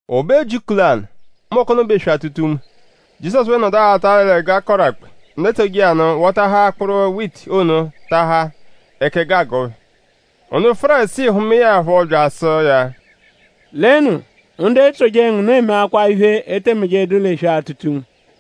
O be ujiku lanụ; mbọku ono bụ eswe-atụta-unme; Jizọsu phẹ nọdu aghata l'ẹgu, a kọru akpe. Ndu etsoje iya nụ wọtaahaa akpụru witi ono taahaa; ẹka ẹgu agụ phẹ. Ndu Fárisii hụmae ya phọ bya asụ iya: “Lenu; ndu etsoje ngu nụ emeakwaa iphe, e te mejedu l'eswe-atụta-unme!”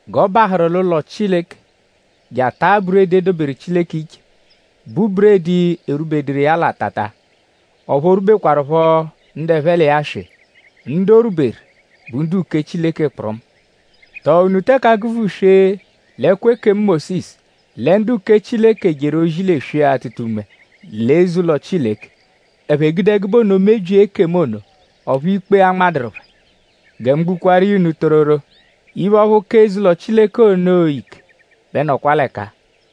G'ọ bahụru l'ụlo Chileke je ataa buredi, e doberu Chileke iche, bụ buredi erwubeduru iya l'atata; ọphu o rwubekwarụpho ndu ẹphe l'iya swị. Ndu o rwuberu bụ ndu-uke Chileke kpụrumu. ?Tọo unu teke agụ-vuswee l'ẹkwo ekemu Mósisu lẹ ndu-uke Chileke jeru ozi l'eswe-atụta-unme l'eze-ụlo Chileke? Ẹphe gude ẹgube ono mebyia ekemu ono; ọphu ikpe anmadụru phẹ. Gẹ mu gbukwaaru iya unu tororo; iphe ọphu ka eze-ụlo Chileke ono ike bẹ nọkwa l'ẹka-a.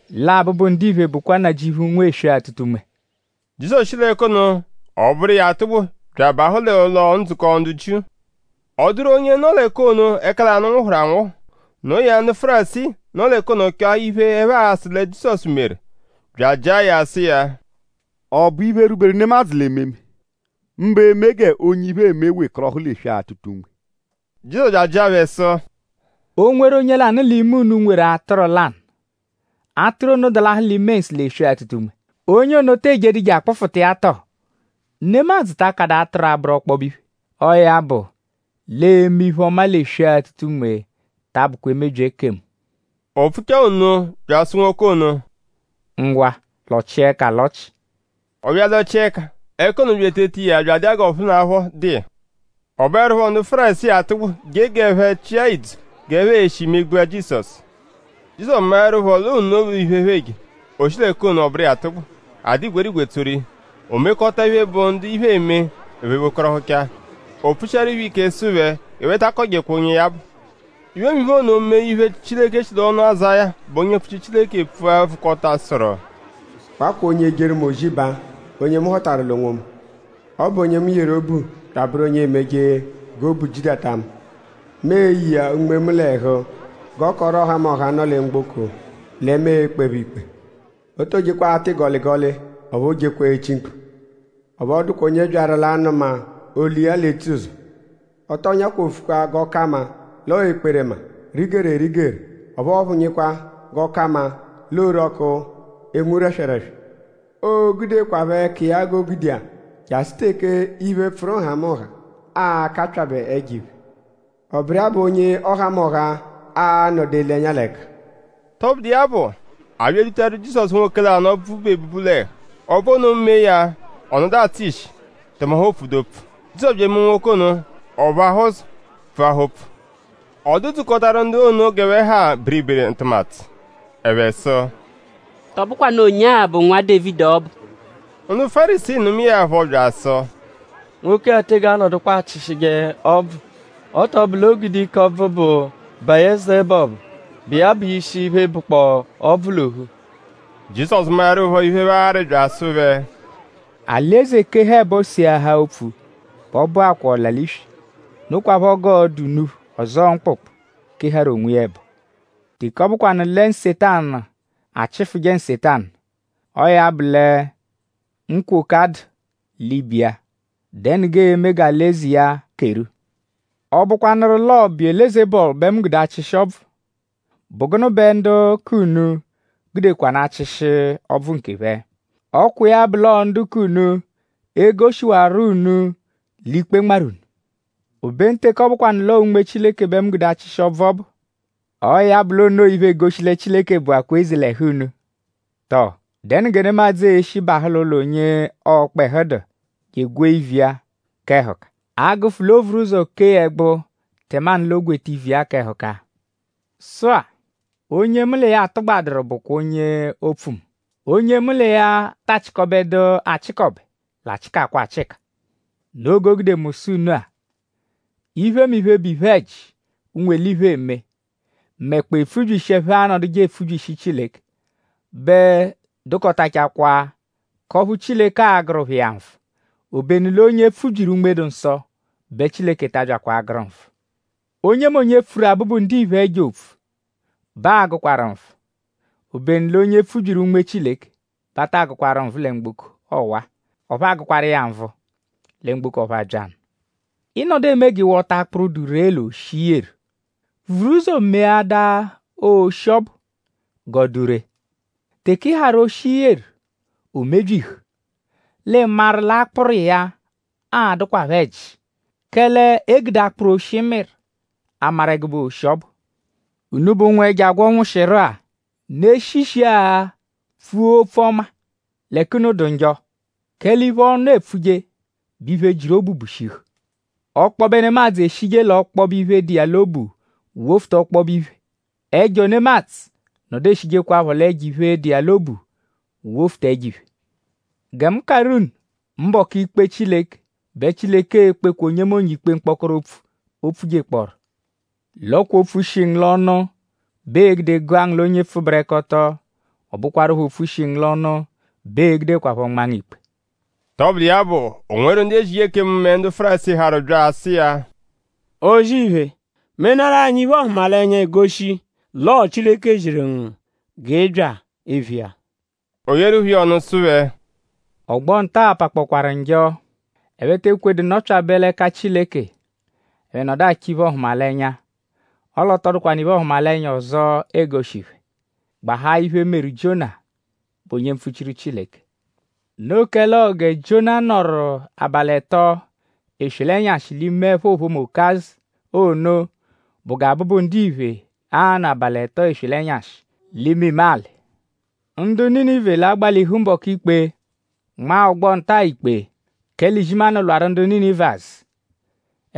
Lẹ Abụbu-Ndiphe bụkwa Nnajịuphu, nwe eswe-atụta-unme.” Jizọsu shi l'ẹka ono; ọ bụru iya atụgbu bya abahụ l'ụlo-ndzukọ ndu Jiu. Ọ dụru onye nọ l'ẹka ono ẹka lanụ nwụhuru anwụhu. Noo ya; ndu Fárisii, nọ l'ẹka ono chọo iphe, ẹphe a-sụ lẹ Jizọsu meru; bya ajịa ya sụ iya: “?Ọ bụ iphe, rwuberu nemadzụ l'ememe; mbụ eme g'onye iphe eme wekọrohu l'eswe-atụta-unme?” Jizọsu bya ajịa phẹ sụ: “O -nweru onye lanụ l'ime unu, nweru atụru lanụ; atụru ono dalahụ l'ime nsụ l'eswe-atụta-unme;?onye ono tee jedu je akpụfuta iya tọ? ?Nemadzụ ta akadụ atụru abụru ọkpobe iphe? Ọo ya bụ l'eme iphe-ọma l'eswe-atụta-unme ta abụkwa emebyi ekemu.” O pfuchaa nno bya asụ nwoke ono: “Ngwa; lọchia ẹka alọchi.” Ọ bya alọchia ẹka. Ẹka ono bya eteta iya bya adụ iya g'ọphunapho dụ iya. Ọ bụerupho ndu Fárisii atụgbu je g'ẹphe chịa ìdzù g'ẹphe e-shi megbua Jizọsu. Jizọsu maẹrupho l'onoo iphe, ẹphe eje; o shi l'ẹka ono; ọ bụru iya atụgbu. A dụ igwerigwe tsoru iya. O mekọta iphe, bụ ndu iphe eme; ẹphe wekọrohucha. O pfushiaru phẹ ike sụ phẹ g'ẹphe ta akọjekwa onye ya bụ. Iphemiphe ono mee iphe, Chileke shi l'ọnu Azáya, bụ onye mpfuchiru Chileke pfua vụkota; sụru: “Wakwa onye ejeru mu ozi baa; onye mu họtaru l'onwomu. Ọ bụ onye mu yeru obu bya abụru onye emeje g'obu jidata mu. Mu e-ye iya Unme mu l'ẹhu g'ọ kọoru ọhamoha, nọ lẹ mgboko lẹ mu e-kpe phẹ ikpe. O too jekwa atụ ịgoligoli; ọphu oojekwa echi mkpu. Ọphu ọ dụkwa onye byaru l'anụma olu iya l'etsuzọ. Ọ tọo nyakwofukwa g'ọ ka mma l'ọ ekperema, rigeru erigeru; ọphu ọ phụnyikwa g'ọ ka mma l'ọ orọku, enwu rẹswereswe. Oo-gudeẹkwapho ẹka iya g'o gude iya jasụ teke iphe, pfụru nhamụnha a-kapyabẹ ẹjo-iphe. Ọ bụru iya bụ onye ọhamoha a-nọdu ele ẹnya l'ẹka.” Tọbudu iya bụ; a bya edutaru Jizọsu nwoke lanụ, ọbvu bu ebubu l'ẹhu. Ọbvu ono mee ya; ọ nọdu atsụ ishi; tẹme ọphu o pfudu opfu. Jizọsu bya emee nwoke ono; ọ phụahaa ụzo; pfuahaa opfu. Ọ dụ-dzukọtaru ndu ono g'ẹphe ha biribiri ntụmatu. Ẹphe sụ: “?Tọ bụkwanu onye-a bụ Nwa Dévidi ọbu?” Ndu Fárisii nụmae ya phọ bya asụ: “Nwoke-a tege anọdukwa achịshije ọbvu; ọ tọ bụ l'o gude ike ọbvu, bụ Biyelezebọlu, bụ iya bụ ishi iphe, bụkpoo ọbvu l'ophu.” Jizọsu maẹrupho iphe, ẹphe arị bya asụ phẹ: “Alị-eze -keha ẹbo; seahaa opfu bẹ ọ bụakwaa ọla-l'iswi. Nokwaphọ g'ọo-dụ unuphu; ọzoo mkpụkpu, keharu onwiya ẹbo. Teke ọ bụkwanu lẹ Nsetanu achịfuje Nsetanu; ọo ya bụ lẹ nkwoka dụ l'ibe iya;?dẹnu g'ee-me g'alị-eze iya keru? Ọ -bụkwanuru l'ọo Biyelezebọlu bẹ mu gude achịshi ọbvu;?bụ gụnu bẹ ndu k'unu gudekwanụ achịshi ọbvu nkephẹ? Ọ kwa iya bụ l'ọo ndu k'unu e-goshiwarọ unu l'ikpe nmarụ unu. Obenu teke ọ bụkwanu l'ọo Unme Chileke bẹ mu gude achịshi ọbvu ọbu; ọo ya bụ l'o noo iphe, egoshi lẹ Chileke bụakwaa eze l'ẹhu unu. “Tọo?dẹnu gẹ nemadzụ e-shi bahụ l'ụlo onye ọkpehu dụ je egwee ivu iya k'ẹhuka; a -gụfu l'o vuru ụzo kee ya ẹgbu tẹmanu l'o gweta ivu iya k'ẹhuka. “Sụ-a; onye mu l'iya atụgbaduru bụkwa onye opfu mu; onye mu l'iya ta achịkobedu achịkobe l'achịkakwa achịka. Noo g'o gude mu sụ unu-a; iphemiphe, bụ iphe-ẹji, ụnwu-eliphe eme; mẹkpoo epfubyishi, ẹphe anọduje epfubyishi Chileke bẹ dụkotachakwaa k'ọphu Chileke a-gụru phẹ iya nvụ; obenu l'onye pfubyiru Unme-dụ-Nsọ bẹ Chileke ta abyakwa agụru nvụ. Onyemonye, pfuru Abụbu-Ndiphe ẹjo opfu bẹ aa-gụkwaru nvụ; obenu l'onye pfubyiru Unme Chileke bẹ a taa gụkwaru nvụ lẹ mgboko ọwa; ọphu aa-gụkwaru iya nvụ lẹ mgboko ọphu abya nụ.” “Ị -nọdu eme g'ị wọta akpụru dụ ree l'oshi, i yeru; vuru ụzo meadaa oshi ọbu g'ọ dụ ree. Teke i harụ oshi, i yeru; o mebyihu; l'ii-maru l'akpụru iya a-dụkwapho ẹji; kẹle e gude akpụru, oshi mịru amaru ẹgube oshi, ọ bụ. Unubẹ ụnwu, ẹjo agwọ nwụshiru-a!?Unu e-shi ishiagha pfua opfu ọma l'ẹka unu dụ njọ? kẹle iphe, ọnu epfuje bụ iphe, jiru obu bushihu. Ọkpobe nemadzụ eshije l'ọkpobe iphe, dụ iya l'obu wofuta ọkpobe iphe; ẹjo nemadzụ nọdu eshijekwaphọ l'ẹjo-iphe, dụ iya l'obu wofuta ẹjo-iphe. “Gẹ mu karụ unu: mbọku ikpe Chileke bẹ Chileke e-kpekwa onyemonye ikpe mkpọkoro opfu, o pfujekpọoru. L'ọ kwa opfu, shi ngu l'ọnu bẹ ee-gude gụa ngu l'onye pfụberekoto. Ọ bụkwarupho opfu, shi ngu l'ọnu bẹ ee-gudekwaphọ nmaa ngu ikpe.” Tọbudu iya bụ; o nweru ndu ezije ekemu mẹ ndu Fárisii harụ bya asụ iya: “O-zì-iphe; menaarụ anyi iphe-ọhumalenya, e-goshi l'ọo Chileke ziru ngu g'ị bya eviya.” O yeeru phẹ iya ọnu sụ phẹ: “Ọgbo-nta-a pakpọkwaaru njọ. Ẹphe te ekwedu nọpyabe l'ẹka Chileke. Ẹphe nọdu achọ iphe-ọhumalenya. Ọle ọ tọ dụkwanu iphe-ọhumalenya ọzo, ee-goshi phẹ; gbahaa iphe, meru Jiona, bụ onye mpfuchiru Chileke. Noo kẹle ọo gẹ Jiona nọru abalị ẹto: eswe l'ẹnyashi l'ime ẹpho ophomu okazụ ono bụ gẹ Abụbu-Ndiphe a-nọ abalị ẹto; eswe l'ẹnyashi l'imime alị. Ndu Ninive l'a-gbalihu mbọku ikpe; nmaa ọgbo nta-a ikpe; kẹle izimanụ lwarụ ndu Ninive azụ;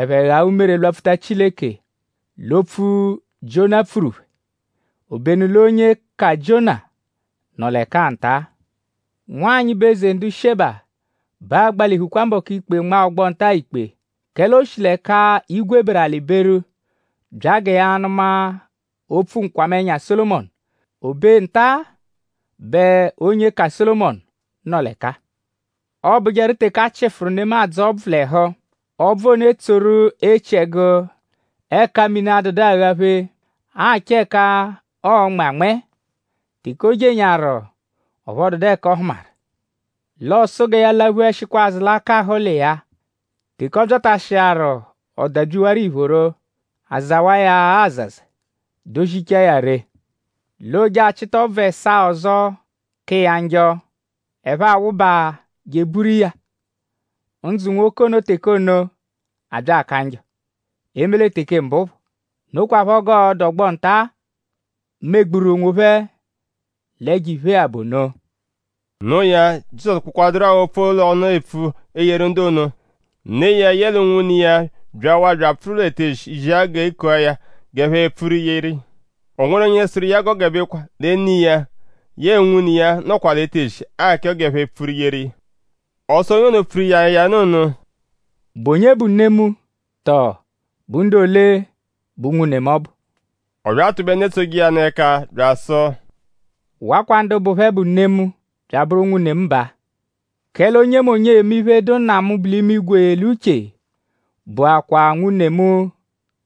ẹphe ghaa umere; lwapfuta Chileke l'opfu, Jiona pfuru phẹ; obenu l'onye ka Jiona nọ l'ẹka-a nta. Nwanyị, bụ eze ndu Sheba bẹ a-gbalihukwa mbọku ikpe; nmaa ọgbo nta-a ikpe; kẹle o shi l'ẹka igwe beru; alị beru bya gẹ ya nụma opfu nkwamẹnya Sólomọnu. O be nta-a bẹ onye ka Sólomọnu nọ l'ẹka-a.” “Ọobujeru teke a chịfuru nemadzụ ọbvu l'ẹhu; ọbvu ono etsoru echiẹgu ẹka mini adụdu aghaphe; achọ ẹka ọo-nmẹ anmẹe. Teke o jenyaaru; ọphu ọ dụdu ẹka ọ hụmaru; l'ọ sụ gẹ ya laphuẹshikwa azụ l'akahụ ụlo iya-a. Teke ọ byatashiaru ọ dabyiwaru iphoro; a zawa iya azaza; dozichaa ya ree; l'oo je achịta ọbvu ẹsaa ọzo, ka iya njọ; ẹphe awụba je eburu iya. Ndzụ nwoke ono teke ono abya aka njọ; eme lẹ teke mbụ phọ. Nokwaphọ g'ọo-dụ ọgbo nta-a, megburu onwophẹ l'ẹjo-iphe-a bụ ono.” Noo ya; Jizọsu kpụkwaduru-a opfu l'ọnu epfu eyeru ndu ono; ne iya yẹle unwune iya byawaa bya apfụru l'etezi zia sụ g'e kua ya g'ẹphe pfuru yeru iya. O nweru onye sụru iya g'o gebekwa lẹ ne iya yẹe unwune iya nọkwa l'etezi achọ g'ẹphe pfuru yeru iya. Ọ sụ onye ono, pfuru iya ya nụ ono: “?Bụ onye bụ ne mu; tọo bụ ndu ole bụ unwune mu ọbu?” Ọ bya atụbe ndu etsoje iya nụ ẹka bya asụ: “Wakwa ndu bụ phẹ bụ ne mu; bya abụru unwune mu baa. Kẹle onyemonye eme iphe, dụ Nna mu, bu l'imigwe l'uche; bụakwaa nwune mu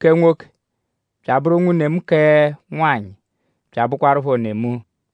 kẹ nwoke; bya abụru nwune mu kẹ nwanyị; bya abụkwarupho ne mu.”